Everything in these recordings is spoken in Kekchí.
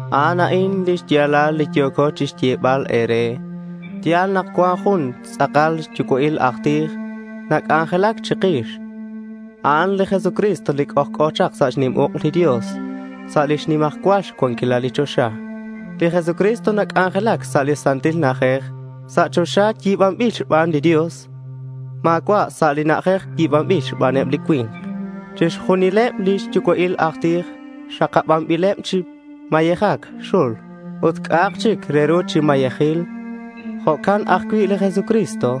A'an a'in xya̱lal li yo̱co chixyebal e̱re: ya̱l nak cuan jun tz'akal xyucua'il aj tij nac'anjelac chikix. A'an li Jesucristo li c'ojc'o chak sa' xnim uk' li Dios sa' lix nimajcual xcuanquilal sa' choxa. Li Jesucristo nac'anjelac sa' li Santil Na'ajej sa' choxa li yi̱banbil xban li Dios, ut ma̱cua' sa' li na'ajej yi̱banbil xbaneb li cui̱nk. Chixjunileb li xyucua'il laj tij xakabanbileb chi mayejac xul ut c'a'ak chic re ru chi mayejil. Jo'can ajcui' li Jesucristo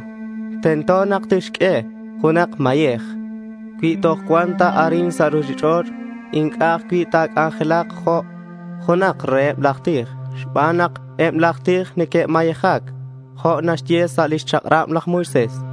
tento tixq'ue junak mayej. Cui toj cuan ta arin sa' ruchich'och' inc'a' ajcui' ta̱c'anjelak jo' junak reheb laj tij xban nak eb laj tij neque'mayejac jo' naxye lix chak'rab laj Moisés.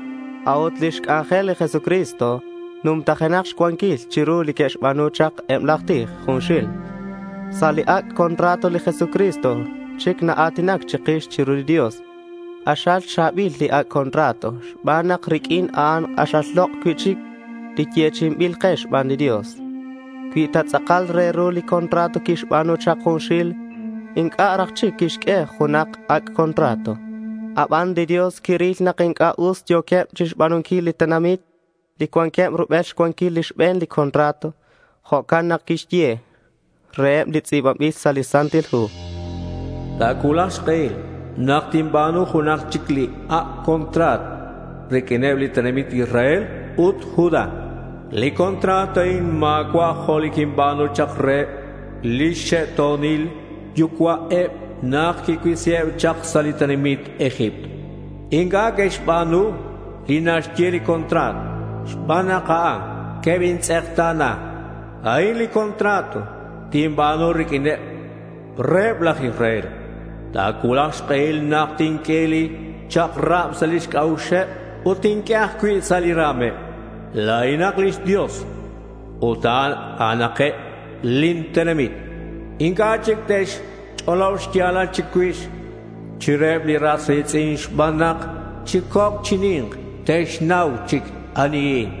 A'ut lix c'anjel li Jesucristo numtajenak xcuanquil chiru li que'xba̱nu chak eb laj tij junxil. Sa' li ac' contrato li Jesucristo chic naa̱tinac chikix chiru li Dios. K'axal cha̱bil li ac' contrato xban nak riq'uin a'an k'axal lok' cui'chic li yechi'inbil ke xban li Dios. Cui ta tz'akal re ru li contrato quixba̱nu chak junxil inc'a' raj chic quixq'ue junak ac' contrato. Aban li Dios quiril nak inc'a' us yo̱queb chixba̱nunquil li tenamit li cuanqueb rubel xcuanquil li xbe̱n contrato. Jo'can nak quixye reheb li tz'i̱banbil sa' li Santil Hu: Ta̱cuulak xk'ehil nak tinba̱nu junak chic li ac' contrato riq'uineb li tenamit Israel ut Judá. Li contrato a'in ma̱cua' jo' li quinba̱nu chak reheb lix xe'to̱nil yucua'eb nak quicuisiheb chak sa' li tenamit Egipto. Inc'a' que'xba̱nu li naxye li contrato. Xban a'an quebintz'ekta̱na. A'in li contrato tinba̱nu riq'uineb reheb laj Israel. Ta̱cuulak xk'ehil nak tinq'ue lin chak'rab sa' lix c'a'uxeb ut tinq'ue ajcui' sa' li ra̱meb. La̱inak lix Dios ut a'anakeb lin tenamit. Inc'a' chic te'xch'olob xya̱lal chicuix chiruheb li ras ri̱tz'in xban nak chi coc' chi ni̱nk te'xnau chic anihin.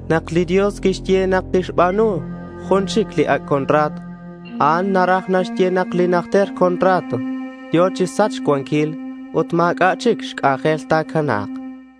Nak li Dios quixye nak tixba̱nu jun chic li ac' contrato a'an naraj naxye nak li najter contrato yo̱ chi sachc xcuanquil ut ma̱c'a' chic xc'anjel ta̱cana̱k.